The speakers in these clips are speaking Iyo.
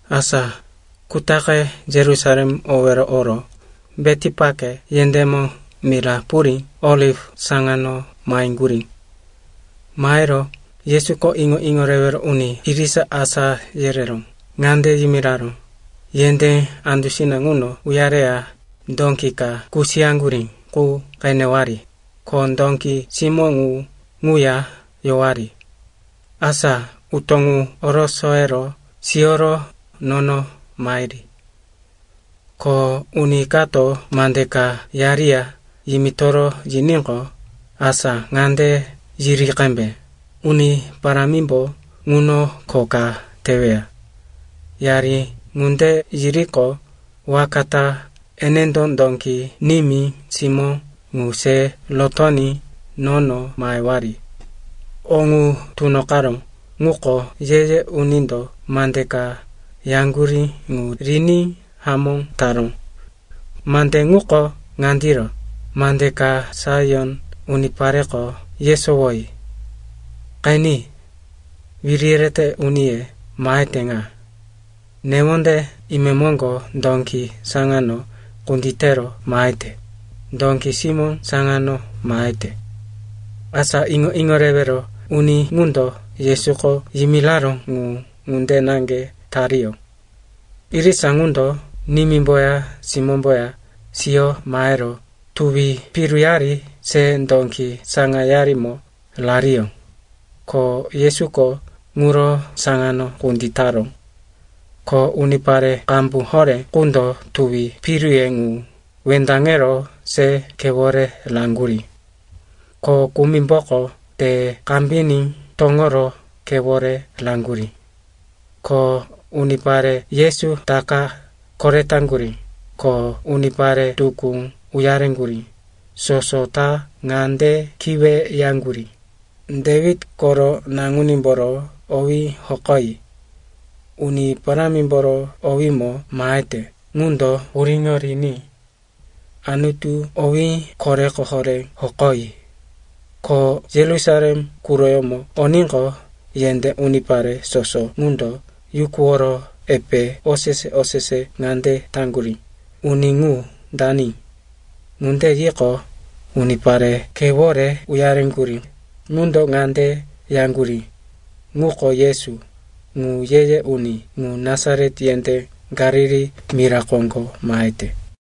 Asa kutaqe Yerusalem owero oro Betipake yendémo mira purí Oliv saŋano maheŋgurí. Mahero Yesuko iŋo-iŋo rewero uni irisa asá yerero ŋande yimiraró, “Yendé andusina ŋuno uyareya dóki ka kusiyaŋgurí qu qenewari, ko dóki simó ŋu ŋuya yowari. Asa utó ŋu orosoyero siyoro nono mahiri. Ko uni kato mande ka yariya yimitoro yiníqo, asa ŋande yiri qembe, ‘Uni Parámimbo ŋuno kho ka teweya.’ Yari ŋunde yiriqo, waka ta enendo dóki nimí, simó ŋu se rotoní nono mahewari.” O ŋu tunoqaró ŋuko ye-ye unindo mande ka yaŋgurí ŋu riní hamó taró. Mande ŋuko ŋandiro, “Mande ka Saion unipareko yesowoyi, ‘Qeni. Wiri yerete uniye mahete ŋa. Newonde imemoŋgo dóki saŋano kunditero mahete, dóki simó saŋano mahete.’” Asa iŋo-iŋo rewero uni ŋundo Yesuko yimiraró ŋu ŋunde naŋge tariyó. Irisa ŋundo nimímboya simómboya siyo mahero tuwi piruyari se dóki saŋayarimo rariyó. Ko Yesuko ŋuro saŋano kunditaró. Ko unipare qambu horé qundo tuwi piruye ŋu wendaŋero se khewore raŋgurí. Ko kumimboko te kambiní toŋoro khewore raŋgurí. Ko unipare Yesu taka koretaŋgurí ko unipare tukú uyareŋgurí, soso ta ŋande kiweyaŋgurí, “Dewit koro Naŋunímboro owí hokoyi! Uni Parámimboro owímo mahete ŋundo puriŋo riní! Anutu owí koreko horé hokoyi!” Ko Yerusalem quroyómo oníqo, yendé unipare soso ŋundo yukuworo epe osese-osese ŋande taŋgurí, “Uni ŋu dani?” Ŋunde yiqo, unipare khewore uyaŋgurí ŋundo ŋande yaŋgurí, “Ŋuko Yesu, ŋu ye-ye uni ŋu Nasaret yendé Galili mira koŋgo mahete.”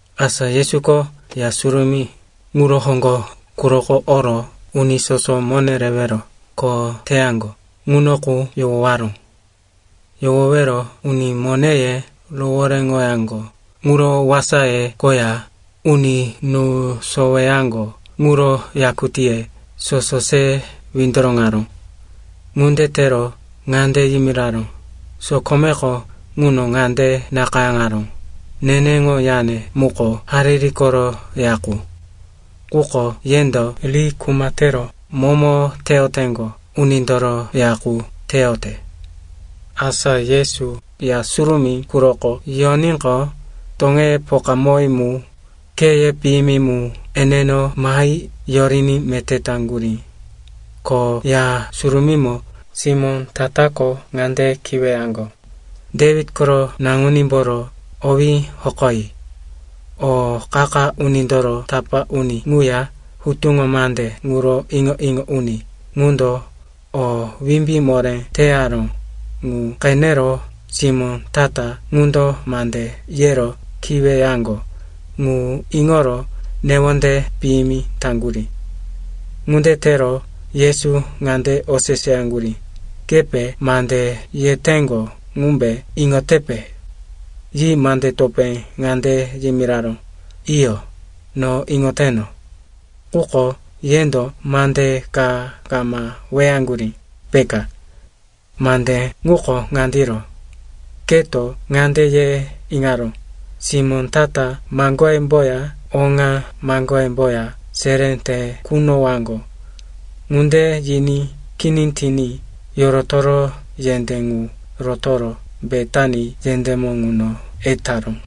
Asa Yesuko Ya Surumí ŋuro hoŋgo quroko oro uni soso mone rewero kho teyaŋgo ŋuno qu yohowaró. Yohowero uni moneye rohoréŋoyaŋgo ŋuro wasaye koya uni nú soweyaŋgo ŋuro yakutíye soso se windoroŋaró. Ŋunde tero ŋande yimiraró, “Sokomeko ŋuno ŋande nakayáŋaró, ‘Neneŋo yane muko hariri koro ya qu.’ Quko yendo ri ‘kuma tero momo teyoteŋgo unindoro ya qu teyote.’” Asa Yesu Ya Surumí quroko yoníqo, toŋeye pokamowí mu, kheye piyimi mu eneno mahi yoriní meté taŋgurí. Ko Ya Surumímo simó ta-tako ŋande kiweyaŋgo, “Dewit koro naŋunímboro owí hokoyi!” O qa-qa unindoro tapá uni ŋuya hutuŋo mande ŋuro iŋo-iŋo uni ŋundo o wimbí moré teyaró ŋu qenero simó ta-ta ŋundo mande yero kiweyaŋgo ŋu iŋoro newonde piyimi taŋgurí. Ŋunde tero Yesu ŋande oseseyaŋgurí, “Kepe mande yeteŋgo ŋumbe iŋotepe?” Yi mande topé ŋande yimiraró, “Iyo, no iŋoteno. Quko yendo mande ka kama weyaŋgurí, peka? Mande ŋuko ŋandiro: “‘Keto ŋande ye iŋaró, simó ta-ta maŋgoyemboya oŋa maŋgoyemboya seré te kunowaŋgo.’” Ŋunde yiní kini tiní yorotoro yendé ŋu rotoro Betani yendémo ŋuno etaró.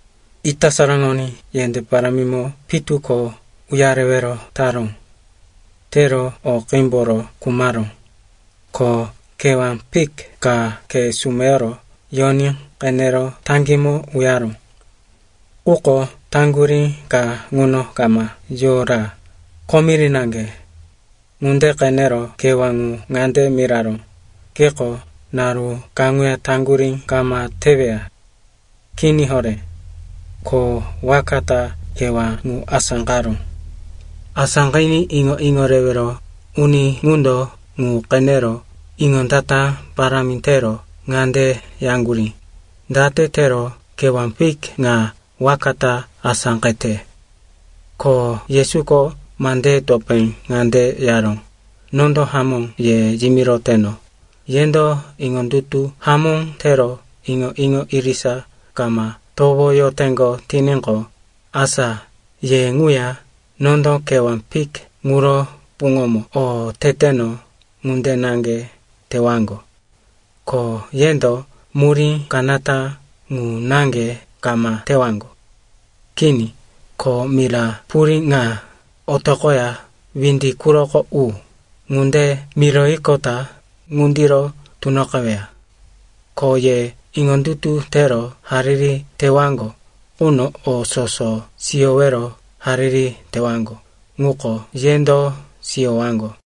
Ita saraŋoní yendé parámimo pitu ko uyarewero taró. Tero o qímboro khumaró. Ko kewá fik ka khe sumeyoro yoní qenero taŋgímo uyaró. Quko taŋgurí ka ŋuno kama yora, komiri naŋge. Ŋunde qenero kewá ŋu ŋande miraró, “Keko naru kaŋuya taŋgurí kama teweya. Kini horé.” Ko waka ta kewá ŋu asáqaró. Asáqiní iŋo-iŋo rewero uni ŋundo ŋu qenero iŋondata parámi tero ŋande yaŋgurí, “Date tero kewá fik ŋa waka ta asáqete?” Ko Yesuko mandeye topé ŋande yaró, “Nondo hamó ye yimiroteno, yendo iŋondutu hamó tero iŋo-iŋo irisa kama towoyoteŋgo tiníqo, asa ye ŋuya nondo kewá fik ŋuro puŋomo o teteno ŋunde naŋge tewaŋgo. Ko yendo murí kanata ŋu naŋge kama tewaŋgo. Kini, ko mira purí ŋa, ‘Otoqoya windi quroko u,’ ŋunde miroyiqota ŋundiro tunoqeweya. Ko ye iŋondutu tero hariri tewaŋgo quno o soso siyowero hariri tewaŋgo ŋuko yendo siyowaŋgo.”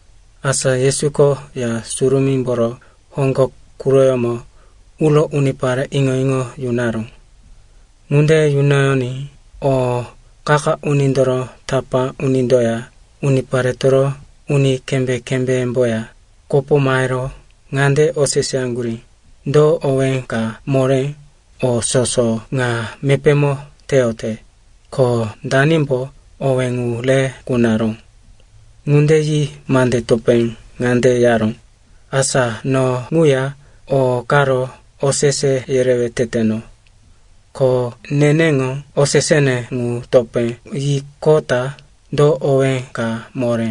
Asa Yesuko Ya Surumímboro hoŋgo quroyómo uro unipare iŋo-iŋo yunaró. Ŋunde yunoyoní o qa-qa unindoro tapá unindoya uniparetoro uni kembé-kembéyemboya kopo mahero ŋande oseseyaŋgurí, “Do owé ka moré o soso ŋa mepémo teyote, ko danimbo owé ŋu re kunaró?” Ŋunde yi mande topé ŋande yaró, “Asa no ŋuya o karo osese yerewe teteno. Ko neneŋo osesene ŋu topé yiqota do owé ka moré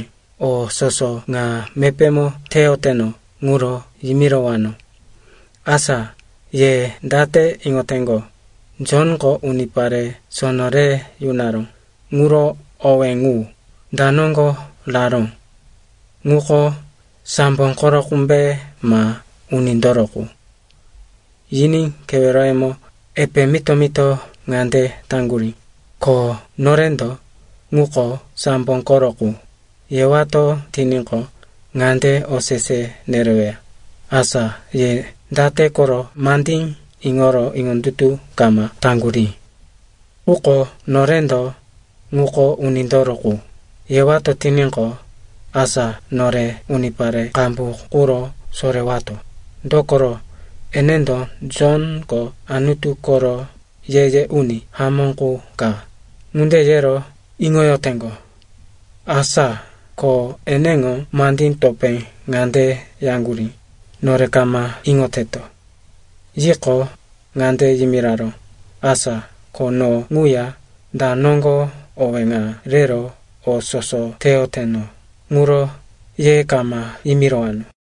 o soso ŋa mepémo teyoteno ŋuro yimirowano. Asa ye date iŋoteŋgo, Jonko unipare sono re yunaró ŋuro owé ŋu, da noŋgo raró? Ŋuko sambo koro qumbe ma unindoro qu?” Yiní keweroyemo epe mito-mito ŋande taŋgurí, “Ko norendo, ‘Ŋuko sambo koro qu,’ yewato tiníqo, ŋande osese nereweya, ‘Asa ye date koro mandí iŋoro iŋondutu kama taŋgurí?’ Quko norendo, ‘Ŋuko unindoro qu,’ yewato tiníqo, asa nore unipare qambu quro sorewato, dokoro, enendo Jonko Anutu koro ye-ye uni hamó qu ka, ŋunde yero iŋoyoteŋgo.” Asa ko eneŋo mandí topé ŋande yaŋgurí, “Nore kama iŋoteto.” Yiqo, ŋande yimiraró, “Asa ko no ŋuya da noŋgo owé ŋa rero o soso teyoteno ŋuro ye kama yimirowano.”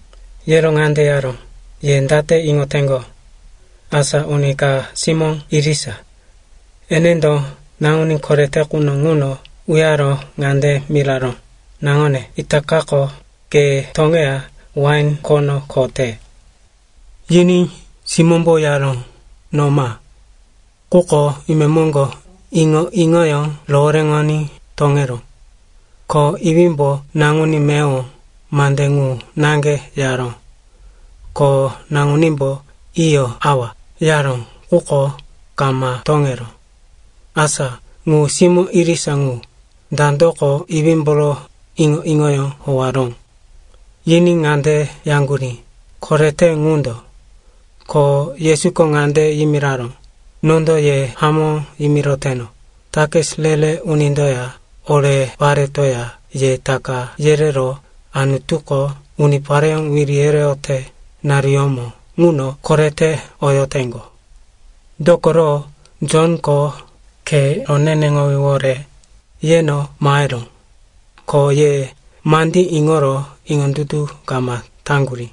Yero ŋande yaró, “Ye date iŋoteŋgo? Asa uni ka simó irisa. Enendo naŋuní korete quno ŋuno uyaro ŋande miraró, ‘Naŋone, itakako ke toŋeya wain khono kho te.’ “Yiní simómbo yaró, ‘No ma.’ Quko imemoŋgo iŋo-iŋoyó rohoréŋoní toŋeró. “Ko iwímbo naŋuní meyowo mande ŋu naŋge yaró. Ko naŋunímbo, ‘Iyo, awa,’ yaró, quko kama toŋeró. “Asa ŋu simó irisa ŋu, dandoko iwímboro iŋo-iŋoyó howaró?” Yiní ŋande yaŋgurí, “Korete ŋundo.” Ko Yesuko ŋande yimiraró, “Nondo ye hamó yimiroteno, takis re-re unindoya ore paretoya ye taka yerero Anutuko unipareyó wiri yereyote naruyómo ŋuno korete oyoteŋgo. Dokoro Jonko khe roneneŋowíwore yeno maheró, ko ye mandí iŋoro iŋondutu kama taŋgurí.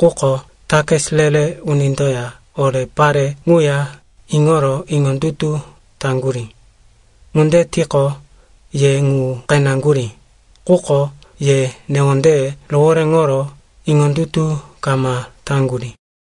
Quko takis re-re unindoya ore pare ŋuya iŋoro iŋondutu taŋgurí. Ŋunde tiqo, ye ŋu qeneŋgurí, quko ye newondeye rohoréŋoro iŋondutu kama taŋgurí.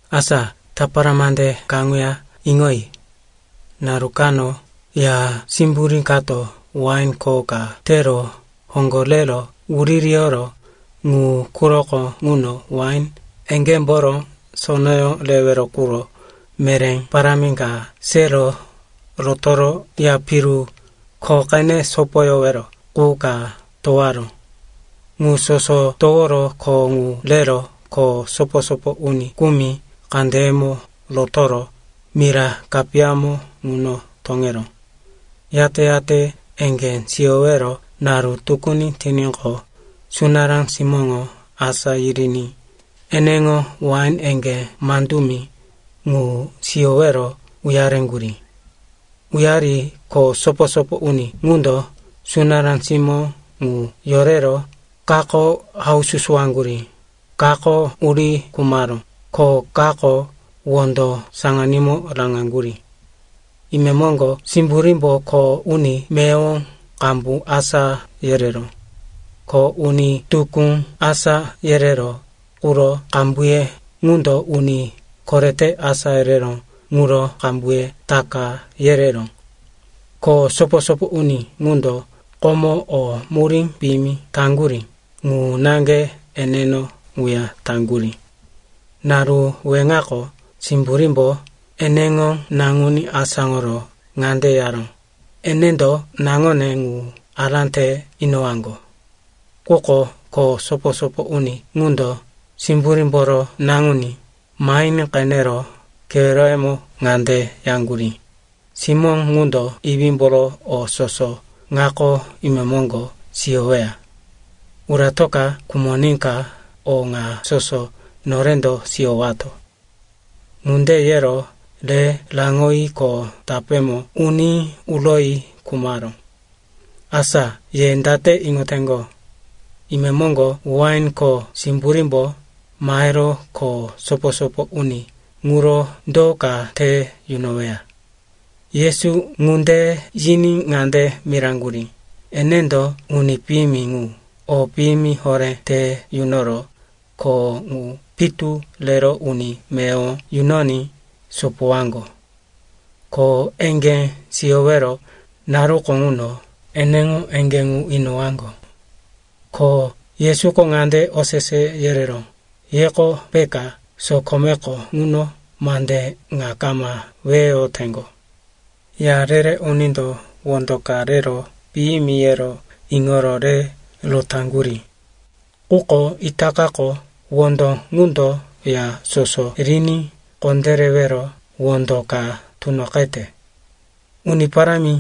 “Asa tapara mande kaŋuya iŋoyi. Naru kano ya simburí kato wain kho ka tero hoŋgo rero wuririyoro ŋu quroko ŋuno wain eŋgémboro sonoyó rewero quro meré parámi ka sero rotoro ya piru kho qene sopoyowero qu ka towaró. Ŋu soso toworo kho ŋu rero kho sopo-sopo uni kumi kandeyemo rotoro mira kapiyamo ŋuno toŋeró. Yate-yate eŋgé siyowero naru tukuni tiníqo, sunará simóŋo asá yiriní eneŋo wain eŋgé mandumi ŋu siyowero uyareŋgurí. “Uyari kho sopo-sopo uni ŋundo sunará simó ŋu yorero kako haususuwaŋgurí, kako uri khumaró ko kako wondo saŋanímo raŋaŋgurí. Imemoŋgo simburímbo kho uni meyowo qambu asá yereró. Ko uni tukú asá yereró quro qambuye ŋundo uni korete asá yereró ŋuro qambuye taka yereró. Ko sopo-sopo uni ŋundo komo o murí piyimi taŋgurí ŋu naŋge eneno ŋuya taŋgurí. Naru weŋako simburímbo eneŋo naŋuní asáŋoro ŋande yaró, ‘Enendo naŋone ŋu ará te inowaŋgo.’ “Quko kho sopo-sopo uni ŋundo simburímboro naŋuní mahiní qenero keweroyemo ŋande yaŋgurí, ‘Simó ŋundo iwímboro o soso ŋako imemoŋgo siyoweya. Uratoka khumoníka o ŋa soso norendo siyowato.’ Ŋunde yero re raŋoyi kho tapémo uní uroyi khumaró. “Asa ye date iŋoteŋgo? Imemoŋgo wain kho simburímbo mahero kho sopo-sopo uni ŋuro do ka te yunoweya?” Yesu ŋunde yiní ŋande miraŋgurí, “Enendo uni piyimi ŋu o piyimi horé te yunoro kho ŋu pitu rero uni meyowo yunoní sopowaŋgo. Ko eŋgé siyowero naruko ŋuno eneŋo eŋgé ŋu inowaŋgo.” Ko Yesuko ŋande osese yereró, “Yeko peka sokomeko ŋuno mande ŋa kama weyoyoteŋgo? “‘Ya re-re unindo wondo ka rero piyimi, yero iŋoro re rotaŋgurí, quko itakako wondo ŋundo ya soso riní kondérewero wondo ka tunoqete. Uni Parámi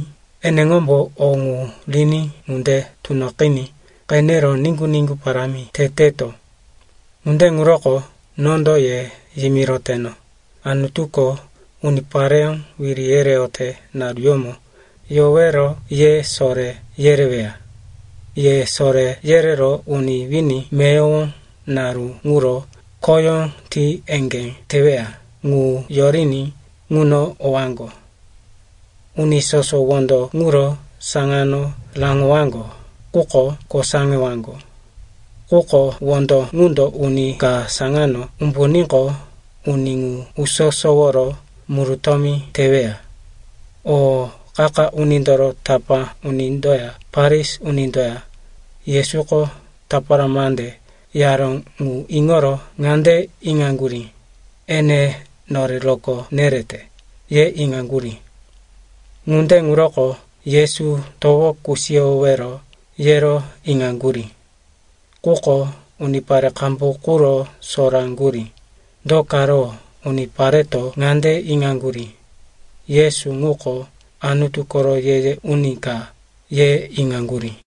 eneŋombo o ŋu riní ŋunde tunoqiní qenero niŋgu-niŋgu parámi teteto.’ “Ŋunde ŋuroko nondo ye yimiroteno, Anutuko unipareyó wiri yereyote naruyómo yowero ye soré yereweya. Ye soré yerero uni wini meyowo naru ŋuro khoyó ti eŋgé teweya ŋu yoriní ŋuno owaŋgo. Uni soso wondo ŋuro saŋano raŋowaŋgo quko kosaŋewaŋgo. Quko wondo ŋundo uni ka saŋano umbuníqo, uni ŋu uso-soworo murutómi teweya.” O qa-qa unindoro tapá unindoya Farisi unindoya Yesuko tapara mande yaró ŋu iŋoro ŋande iŋaŋgurí, ene nore rokó nerete, ye iŋaŋgurí. Ŋunde ŋuroko Yesu towo kusiyowero yero iŋaŋgurí, quko unipare qambu quro soraŋgurí, do karo unipareto ŋande iŋaŋgurí, Yesu ŋuko Anutu koro ye-ye uni ka, ye iŋaŋgurí.